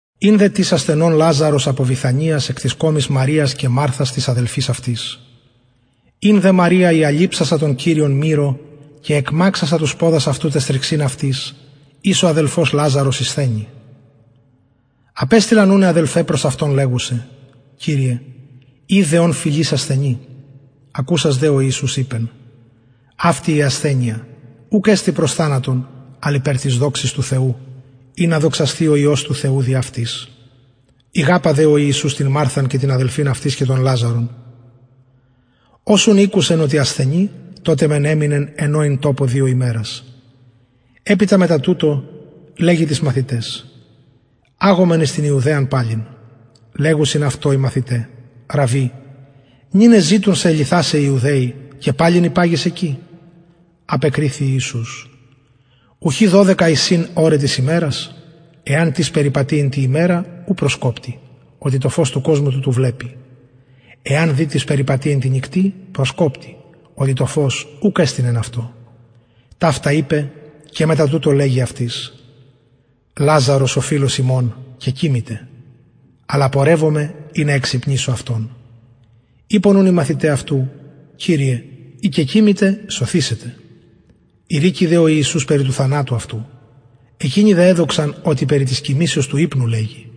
ην δε τις ασθενων λαζαρος απο βηθανιας εκ της κωμης μαριας και μαρθας της αδελφης αυτης ην δε μαρια η αλειψασα τον κυριον μυρω και εκμαξασα τους ποδας αυτου ταις θριξιν αυτης ης ο αδελφος λαζαρος ησθενει απεστειλαν ουν αι αδελφαι προς αυτον λεγουσαι κυριε ιδε ον φιλεις ασθενει ακουσας δε ο ιησους ειπεν αυτη η ασθενεια ουκ εστιν προς θανατον αλλ υπερ της δοξης του θεου ινα δοξασθη ο υιος του θεου δι αυτης ηγαπα δε ο ιησους την μαρθαν και την αδελφην αυτης και τον λαζαρον ως ουν ηκουσεν οτι ασθενει τοτε μεν εμεινεν εν ω ην τοπω δυο ημερας επειτα μετα τουτο λεγει τοις μαθηταις αγωμεν εις την ιουδαιαν παλιν λεγουσιν αυτω οι μαθηται ραββι νυν εζητουν σε λιθασαι οι ιουδαιοι και παλιν υπαγεις εκει απεκριθη ιησους ουχι δωδεκα εισιν ωραι της ημερας εαν τις περιπατη εν τη ημερα ου προσκοπτει οτι το φως του κοσμου τουτου βλεπει εαν δε τις περιπατη εν τη νυκτι προσκοπτει οτι το φως ουκ εστιν εν αυτω ταυτα ειπεν και μετα τουτο λεγει αυτοις λαζαρος ο φιλος ημων κεκοιμηται αλλα πορευομαι ινα εξυπνισω αυτον ειπον ουν οι μαθηται αυτου κυριε ει κεκοιμηται σωθησεται ειρηκει δε ο ιησους περι του θανατου αυτου εκεινοι δε εδοξαν οτι περι της κοιμησεως του υπνου λεγει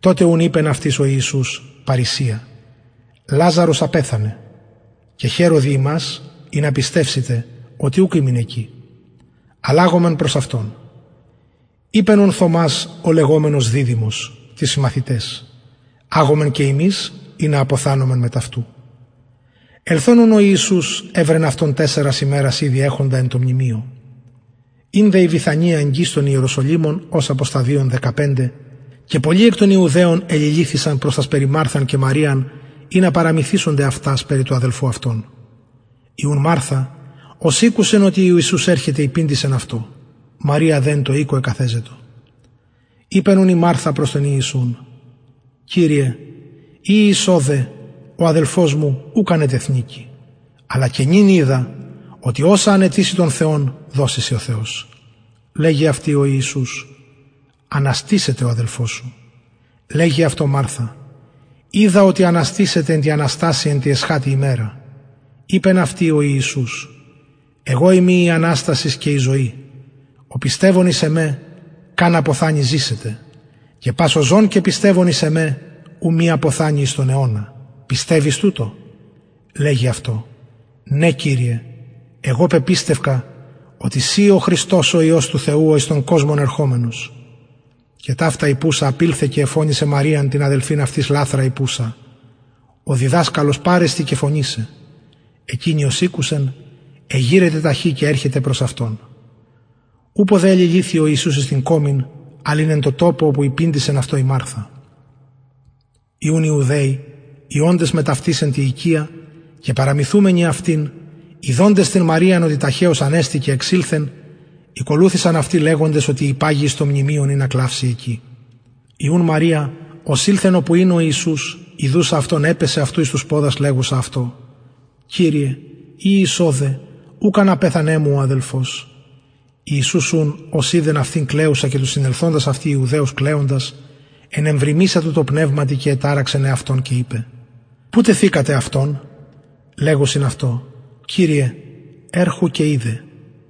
τοτε ουν ειπεν αυτοις ο ιησους παρρησια λαζαρος απεθανεν και χαιρω δι υμας ινα πιστευσητε οτι ουκ ημην εκει αλλα αγωμεν προς αυτον ειπεν ουν θωμας ο λεγομενος διδυμος τοις συμμαθηταις αγωμεν και ημεις ινα αποθανωμεν μετ αυτου ελθων ουν ο ιησους ευρεν αυτον τεσσαρας ημερας ηδη εχοντα εν τω μνημειω ην δε η βηθανια εγγυς των ιεροσολυμων ως απο σταδιων δεκαπεντε και πολλοι εκ των ιουδαιων εληλυθεισαν προς τας περι μαρθαν και μαριαν ινα παραμυθησωνται αυτας περι του αδελφου αυτων η ουν μαρθα ως ηκουσεν οτι ιησους ερχεται υπηντησεν αυτω μαρια δε εν τω οικω εκαθεζετο ειπεν ουν μαρθα προς τον ιησουν κυριε ει ης ωδε ο αδελφος μου ουκ αν ετεθνηκει αλλα και νυν οιδα οτι οσα αν αιτηση τον θεον δωσει σοι ο θεος λεγει αυτη ο ιησους αναστησεται ο αδελφος σου λεγει αυτω μαρθα οιδα οτι αναστησεται εν τη αναστασει εν τη εσχατη ημερα ειπεν αυτη ο ιησους εγω ειμι η αναστασις και η ζωη ο πιστευων εις εμε καν αποθανη ζησεται και πας ο ζων και πιστευων εις εμε ου μη αποθανη εις τον αιωνα πιστευεις τουτο λεγει αυτω ναι κυριε εγω πεπιστευκα οτι συ ει ο χριστος ο υιος του θεου ο εις τον κοσμον ερχομενος και ταυτα ειπουσα απηλθεν και εφωνησεν μαριαν την αδελφην αυτης λαθρα ειπουσα ο διδασκαλος παρεστιν και φωνει σε εκεινη ως ηκουσεν εγειρεται ταχυ και ερχεται προς αυτον ουπω δε εληλυθει ο ιησους εις την κωμην αλλ ην εν τω τοπω οπου υπηντησεν αυτω η μαρθα οι ουν ιουδαιοι οι οντες μετ αυτης εν τη οικια και παραμυθουμενοι αυτην ιδοντες την μαριαν οτι ταχεως ανεστη και εξηλθεν ηκολουθησαν αυτη λεγοντες οτι υπαγει εις το μνημειον ινα κλαυση εκει η ουν μαρια ως ηλθεν οπου ην ο ιησους ιδουσα αυτον επεσεν αυτου εις τους ποδας λεγουσα αυτω κυριε ει ης ωδε ουκ αν απεθανεν μου ο αδελφος ιησους ουν ως ειδεν αυτην κλαιουσαν και τους συνελθοντας αυτη ιουδαιους κλαιοντας ενεβριμησατο τω πνευματι και εταραξεν εαυτον και ειπεν που τεθεικατε αυτον λεγουσιν αυτω κυριε ερχου και ιδε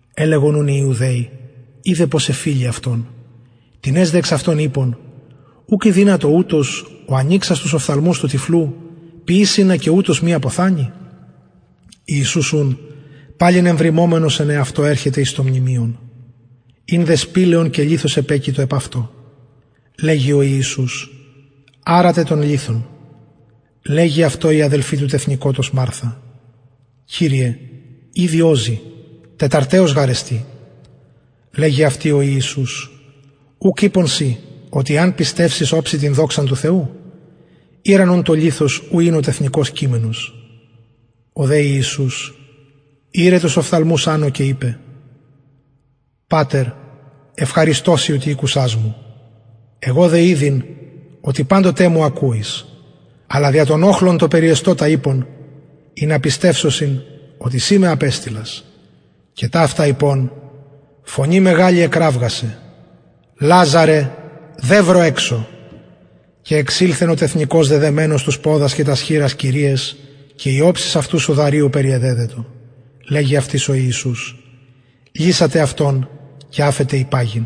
ελεγον ουν οι ιουδαιοι ιδε πως εφιλει αυτον τινες δε εξ αυτων ειπον ουκ ηδυνατο ουτος ο ανοιξας τους οφθαλμους του τυφλου ποιησαι ινα και ουτος μη αποθανη ιησους ουν παλιν εμβριμωμενος εν εαυτω ερχεται εις το μνημειον ην δε σπηλαιον και λιθος επεκειτο επ αυτω λεγει ο ιησους αρατε τον λιθον λεγει αυτω η αδελφη του τεθνηκοτος μαρθα κυριε ηδη οζει τεταρταιος γαρ εστιν λεγει αυτη ο ιησους ουκ ειπον σοι οτι εαν πιστευσης οψει την δοξαν του θεου ηραν ουν τον λιθον ου ην ο τεθνηκως κειμενος ο δε ιησους ηρεν τους οφθαλμους ανω και ειπεν πατερ ευχαριστω σοι οτι ηκουσας μου εγω δε ηδειν οτι παντοτε μου ακουεις αλλα δια τον οχλον τον περιεστωτα ειπον ινα πιστευσωσιν οτι συ με απεστειλας και ταυτα ειπων φωνη μεγαλη εκραυγασεν λαζαρε δευρο εξω και εξηλθεν ο τεθνηκως δεδεμενος τους ποδας και τας χειρας κειριαις και η οψις αυτου σουδαριω περιεδεδετο λεγει αυτοις ο ιησους λυσατε αυτον και αφετε υπαγειν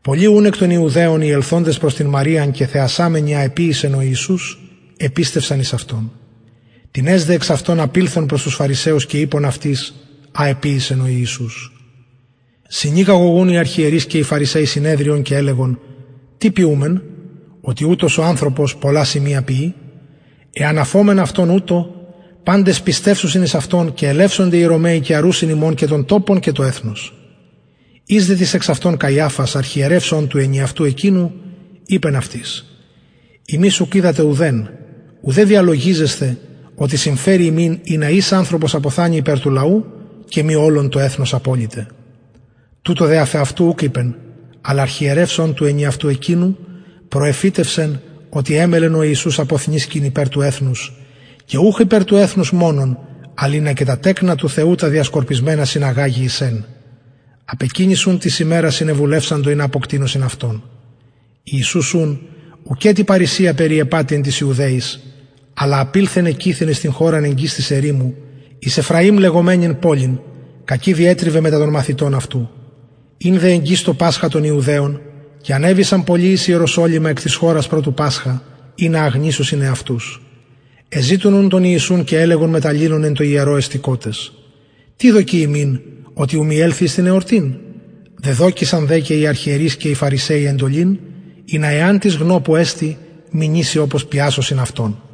πολλοι ουν εκ των ιουδαιων οι ελθοντες προς την μαριαν και θεασαμενοι α εποιησεν ο ιησους επιστευσαν εις αυτον τινες δε εξ αυτων απηλθον προς τους φαρισαιους και ειπον αυτοις α εποιησεν ο ιησους συνηγαγον ουν οι αρχιερεις και οι φαρισαιοι συνεδριον και ελεγον τι ποιουμεν οτι ουτος ο ανθρωπος πολλα σημεια ποιει εαν αφωμεν αυτον ουτως παντες πιστευσουσιν εις αυτον και ελευσονται οι ρωμαιοι και αρουσιν ημων και τον τοπον και το εθνος εις δε τις εξ αυτων καιαφας αρχιερευς ων του ενιαυτου εκεινου ειπεν αυτοις υμεις ουκ οιδατε ουδεν ουδε διαλογιζεσθε οτι συμφερει ημιν ινα εις ανθρωπος αποθανη υπερ του λαου και μη ολον το εθνος αποληται τουτο δε αφ εαυτου ουκ ειπεν αλλα αρχιερευς ων του ενιαυτου εκεινου προεφητευσεν οτι εμελλεν ιησους αποθνησκειν υπερ του εθνους και ουχ υπερ του εθνους μονον αλλ ινα και τα τεκνα του θεου τα διεσκορπισμενα συναγαγη εις εν απ εκεινης ουν της ημερας συνεβουλευσαντο ινα αποκτεινωσιν αυτον ιησους ουν ουκετι παρρησια περιεπατει εν τοις ιουδαιοις αλλα απηλθεν εκειθεν εις την χωραν εγγυς της ερημου εις εφραιμ λεγομενην πολιν κακει διετριβεν μετα των μαθητων αυτου ην δε εγγυς το πασχα των ιουδαιων και ανεβησαν πολλοι εις ιεροσολυμα εκ της χωρας προ του πασχα ινα αγνισωσιν εαυτους εζητουν ουν τον ιησουν και ελεγον μετ αλληλων εν τω ιερω εστηκοτες τι δοκει υμιν οτι ου μη ελθη εις την εορτην δεδωκεισαν δε και οι αρχιερεις και οι φαρισαιοι εντολην ινα εαν τις γνω που εστιν μηνυση οπως πιασωσιν αυτον